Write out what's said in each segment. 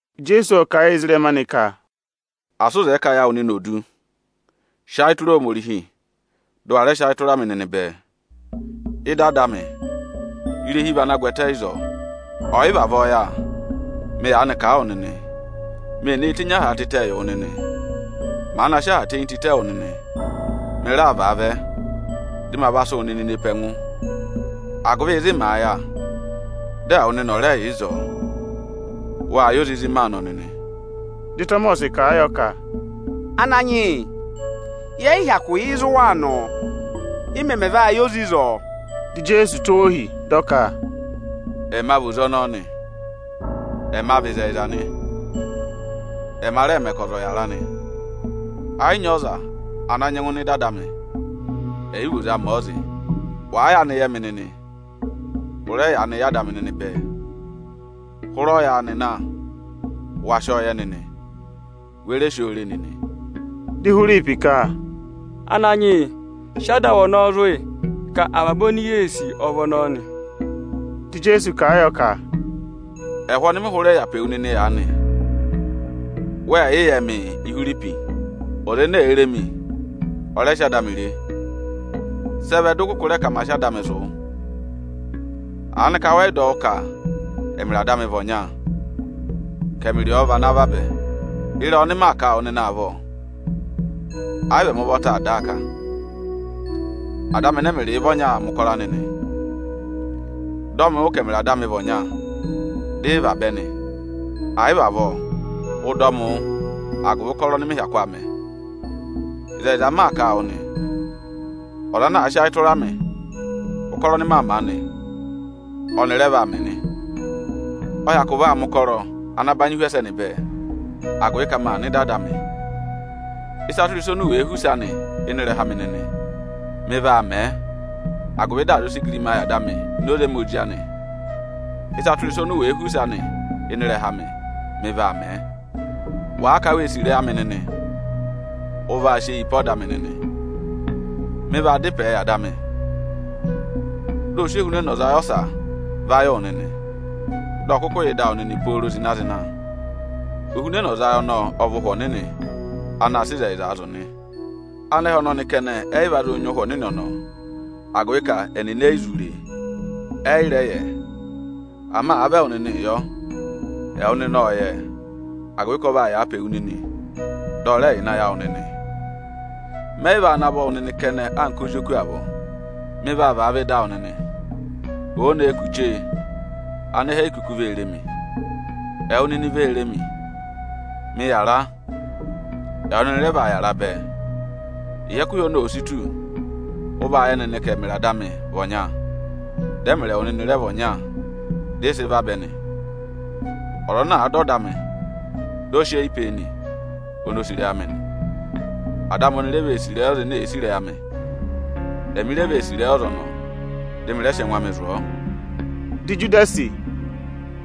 Ijeesu ộ kà a yị ezirẹma anị ka, “Asị ụ zẹẹ ka ayị awụ nịnị ò du! Sị ayị tụra Ohomorihi, dị ụ wa rẹ sị ayị tụra mị nịnị bẹẹ! Ịdị Ada amị, irehi vị ana gwẹtẹ ịzọọ. Ọ̀ yị vavọọ yà, mị yaanị kà a wụ nịnị: Mee nee tenyi aha tịtẹ yị wụ nịnị. Màa na sị aha tenyi tịtẹ wụ nịnị, mị raa vaavẹ, dị ma va sị wụ nịnị ne pe ẹngụ, agụvị ịzị màa yà, dị ẹwụ nịnị ọ̀ rẹ yà ịzọọ. Wâ yẹ oze ịzị maa nọ nịnị.” Dị Ịtọmọsị kà a yọ ka, “Ananyị yị, yẹ yị hyakụ yẹ ịzị ụ waa nọ. Ị mẹmẹ va yẹ oze ịzọọ?” Dị Ijeesu tụ́ ọọ ohi, dị ọ ka, “Ẹma vị oze ọnọọ nị, ẹma vị ịzẹyịza nị, ẹma rẹẹ̄ mẹ ka ọza ọ̀ yàra nị. Ẹ yị nyị ọza ana nyẹngụ nọ ịdị Ada amị, ẹ̀ yị vị oze amị ọ zị. Wàa yaanị yẹ mị nịnị, ụ rẹ yaanị yẹ Ada amị nịnị bẹẹ. Hụrẹ ọyaanị na, wa sị ọọ yẹ nịnị, we re si oo re nịnị.” Dị Ihwiripi ka, “Ananyị yị, sị Ada awụ ọnọ zụ̀ yị, ka avaba oni yee sì ọ vị ọnọọ nị.” Dị Ijeesu kà a yọ ka, “Ẹhụ ọnị mị hụrẹ yà pe wu nịnị aanị, wẹ yị yẹ mịị, Ihwiripi? Ọza ene èe re mi, ọ rẹ sị Ada amị re. Sị ẹ vẹ dị ụ kụkụ rẹ ka ma sị Ada amị zụ̀ wụ? Aanịka wẹ yị dọ wụ́ ka ẹmịrị Ada amị vị ọnya, ka ẹmị rị ọọ vị ana vabẹ? Ịrẹyị ọnị maa kà a wụ nịnị avọọ, ẹ yị vị ẹmị ụvọta aa dà a kà. Ada amị ẹnẹ ẹmịrịị vị ọnya aa mẹ̀ ụkọrọ anị nị. Dọ mị wụ́ ka ẹmịrị Ada amị vị ọnya, dị ị vabẹ nị; ẹ̀ yị vị avọọ, ụ dọ mị wụ́ agụvị ụkọrọ ọnị mị hyakụ aa mẹ! Ịzẹyịza m maa kà a wụ nị, ọza ana àa sị ayị tụra mị, ụkọrọ ọnị maa mẹ̀ aanị, ọ́nị rẹ vaa mẹ nị. Ọ hyakụ vaa mẹ̀ ụkọrọ ana banyị hu ẹsẹnị bẹẹ, agụvị ka maa nọ ịdị Ada amị. Ịsa tụra ịsa oni u wèe họ̀ use anị ịnị ịrẹha amị nịnị, mị vaa mẹ̀ ẹ, agụvị dị à zụ sị igirima yị Ada amị ini oze ẹmị Ozi anị. Ịsa tụra ịsa oni u wèe họ̀ use anị ịnị ịrẹha amị, mị vaa mẹ̀ ẹ.” “Wàa ka wee sì ịrẹyị amị nịnị, ụ vaa saasa ọda amị nịnị. Mị vaa dá ịpẹẹ yị Ada amị, dị ọ sị Ohunẹnọzayị ọsa va yị wụ nịnị, dị ọ̀ kụkụ yà ịdị awụ nịnị pooro zịna-zịna. Ohunẹnọzayị ọnọọ ọ vị Ụhwẹ Ọnịnị anaā sịị ịzẹyịzaa zụ̀ nị. Anẹhẹ ọnọnị kẹnẹ ẹ yị va zụụ nyị Ụhwẹ Ọnịnị ọnọọ, agụvị ka ẹnịnị e yi zụ re e, ẹ yị rẹ va yẹ ẹ. Ama àa vị ẹwụ nịnịị yọ, ẹwụ nịnị ộ yẹ ẹ, agụvị ka ọ vaa yàa pe wu nịnị, dị ọ rẹ yà ịnị ayị awụ nịnị. Mẹ yị vaa navọ wụ nịnị kẹnẹ anka ozi oku avọọ. Mị vaa vaavẹ ịdị awụ nịnị. Òo nee kù chee, anẹhẹ e yi kuku vee re mi. Ẹwụ nịnị vee re mi. Mị yàra, ẹwụ nịnị rẹ vaa yàra bẹẹ. Ịhị ẹkụhị ọnọọ òo si tù, ụ vaa yẹ nịnị ka ẹmịrị Ada amị vị ọnya, dị ẹmịrị ẹwụ nịnị rẹ vị ọnya dị ị sị vabẹ nị. Ọza ana àa dọ ọda amị, dị ọ saasa a nị, oni o sì ịrẹyị amị nị. Ada amị oni re vee sì ịrẹyị ọza ene èe sì ịrẹyị amị. Ẹmị re vee sì ịrẹyị ọza ọnọọ, dị mị rẹ sị ẹngụ amị zụ̀ ọ.” Dị Ijudasi,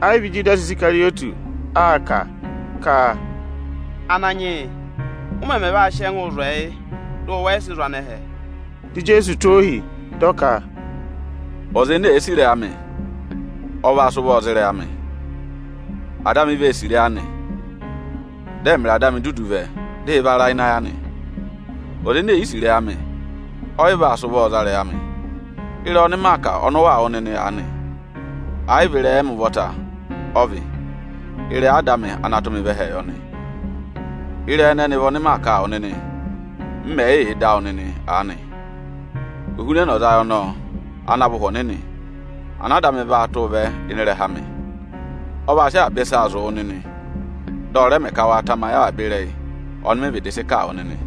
ẹ yị vị Ijudasi Isikarịyọtị aa kà, ka, “Ananyị yị, ụ mẹmẹ vaa sị ẹngụụ zụ̀ ẹyị, dị ụ wẹ yị sị zụ̀ anẹhẹ?” Dị Ijeesu tụ́ ọ ohi, dị ọ ka, “Ọza ene èe sì ịrẹyị amị, ọ vaa sị ụvọọ za ịrẹyị amị; Ada amị vee sì ịrẹyị anị. Dị ẹmịrị Ada amị dudu vẹ, dị ị va ra ịnị ayị anị. Ọza ene è yi sì ịrẹyị amị, ọ yị vaa sị ụvọọ za ịrẹyị amị. Ịrẹyị ọnị maa kà ọnị ụ waa wụ́ nịnị aanị, ẹ yị vị ịrẹyị ẹmị ụvọta ọ vị, ịrẹyị Ada amị ana tụ́ mị vẹ ẹhẹẹ yọ nị. Ịrẹyị ẹnẹnị vị ọnị maa kà a wụ nịnị, m mẹ̀ yị yà ịdị awụ nịnị aanị. Ohunẹnọzayị ọnọọ ana vị Ụhwẹ Ọnịnị, ana Ada amị vaa tụ́ụ vẹ ịnị ịrẹha amị, ọ vaa sị avaba ịsaa zụ̀ wụ nịnị, dị ọ rẹ mẹ ka wa tamayị avaba ịrẹyị ọnị mị vịdị sị kà a wụ nịnị.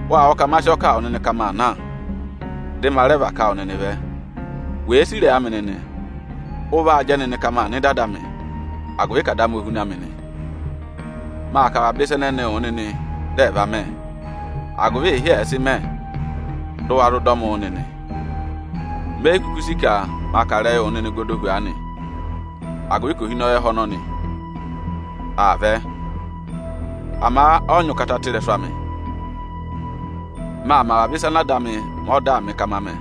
Wâ wụ́ ka ma sị ọọ kà a wụ nịnị ka maa na, dị ma rẹ và ká wụ nịnị vẹ. Wèe sì ịrẹyị amị nịnị, ụ vaa jẹ nịnị ka maa nọ ịdị Ada amị, agụvị ka Ada amị o huna mị nị. Maa kà avaba ịsa ẹnẹnịị wụ nịnị dị ẹ̀ va mẹ, agụvị ịhị ẹ̀ẹ sị mẹ, dị ụ wa zụ dọ mị wụ́ nịnị. Me yi kuku sì ka ma kà ịrẹyịị wụ nịnị gọdọ hu aanị, agụvị ka ohinọyị ẹhẹ ọnọnị aa vẹ. Ama ọ yị nyị ụkata ị́rẹsụ amị. Maa mẹ avaba ịsa ana Ada amị mẹ ọdaa mị ka ma mẹ,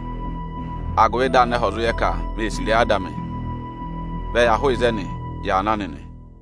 agụvị dị anẹhẹ ẹ̀ zụ yẹ ka mê sì ịrẹyị Ada amị. Vẹ ya hụụ ịzẹnị, ya na nịnị!”